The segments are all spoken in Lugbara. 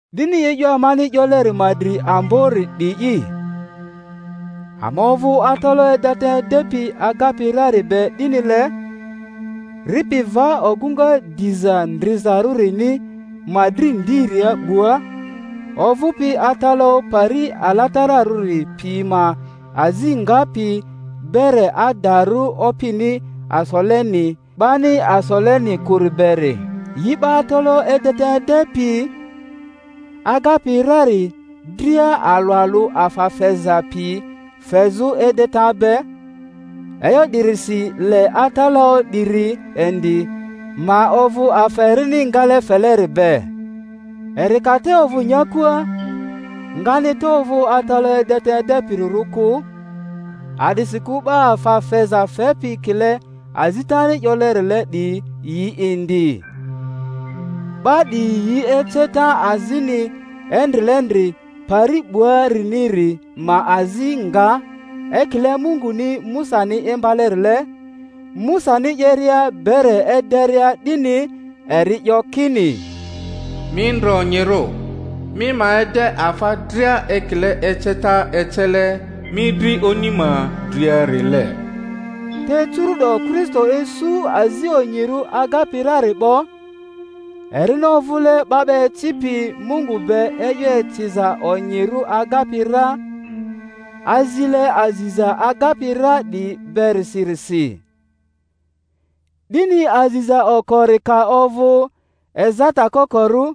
'Dini e'yo amani 'yoleri ma dri ambori 'di'i: ama ovᴜ atalaᴜ edeta edepi agapi rari be 'dinile, ripi va ogᴜŋa Diza Ndrizarᴜrini ma dri ndiria 'bua, ovᴜpi atalaᴜ pari alatararᴜri pi ma azi ngapi, bere adarᴜ Opini asoleni, 'bani asoleni kᴜri beri. Yi 'ba atalaᴜ edeta edepi agapi rari dria alᴜ alᴜ afa feza piyi fezᴜ edeta be; e'yo 'dirisi le atalaᴜ 'diri indi ma ovᴜ afa erini ngale feleri be. Eri ka te ovᴜ nyakua, ngani te ovᴜ atalaᴜ edeta edepirirᴜ kᴜ, a'disikᴜ 'ba afa feza fepi kile azitani 'yolerile 'diyi yi indi. 'Ba 'diyi yi eceta azini endrilendri pari 'buariniri ma azi nga; ekile Munguni Musani imbalerile, Musani 'yeria bere ederia 'dini, eri 'yo kini, Mi ndre onyirᴜ mi ma ede afa dria ekile eceta ecele mi dri oni ma dria-rile. Te curu'do Kristo isu azi onyirᴜ agapi rari 'bo, erini ovᴜle 'ba 'ba ecipi Mungu be e'yo eciza onyirᴜ agapi ra, azile aziza agapi ra 'diyi berisirisi. 'Dini aziza okori ka ovᴜ ezata kokorᴜ,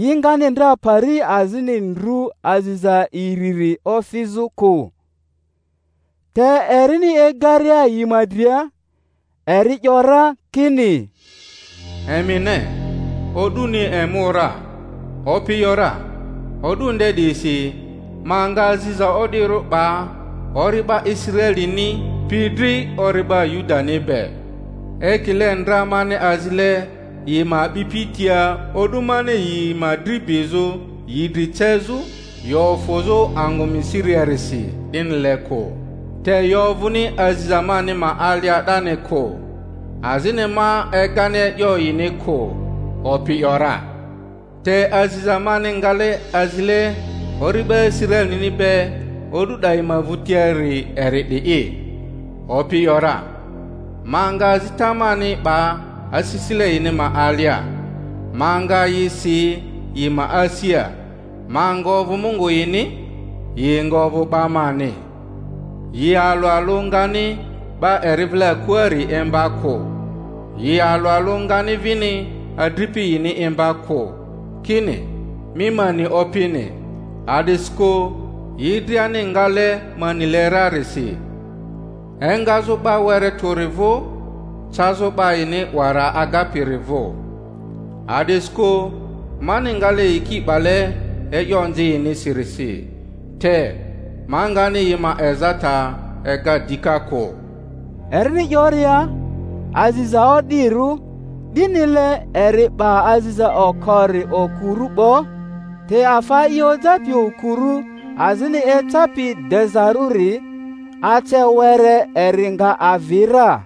yi ngani ndra pari azini ndrᴜ aziza iriri ofizᴜ kᴜ Te erini egaria yi ma dria, eri 'yo ra kini: Emi ne, o'duni emu ra, Opi ‘yora, o'du nde 'diyisi ma nga aziza o'dirᴜ 'ba ori'ba Israelini pi dri ori'ba Yudani be; ekile ndra mani azile yi ma a'bipi tia o'du mani yi ma dri bizᴜ yi dri cezᴜ yi ofᴜzᴜ angᴜ Misiria-risi 'dinile kᴜ; te yi ovᴜni aziza mani ma alia 'dani kᴜ, azini ma egani e'yo yini kᴜ, Opi 'yo ra. Te aziza mani ngale azile ori'ba Israelini be o'du 'dayi ma vᴜtiari eri 'di'i, Opi 'yo ra: Ma nga azita mani 'ba asisile yini ma alia, ma nga yi si yi ma asia; ma nga ovᴜ Mungu yini, yi nga ovᴜ 'ba mani. Yi alᴜ alᴜ ngani 'ba eri vile akuari imba kᴜ, yi alᴜ alᴜ ngani vini adripi yini imba kᴜ, kini, Mi ma ni Opini; a'disikᴜ yi driani ngale ma nile rarisi, engazᴜ 'ba were tᴜri vᴜ cazᴜ 'ba yini 'wara agapiri vᴜ. A'disikᴜ mani ngale yiki 'bale e'yo onzi yinisirisi, te ma ngani yi ma ezata ega dika kᴜ. Erini 'yoria, Aziza o'dirᴜ, 'dinile, eri 'ba aziza okori okurᴜ 'bo. Te afa i ojapi okurᴜ azini ecapi dezarᴜri, ace were eri nga avi ra.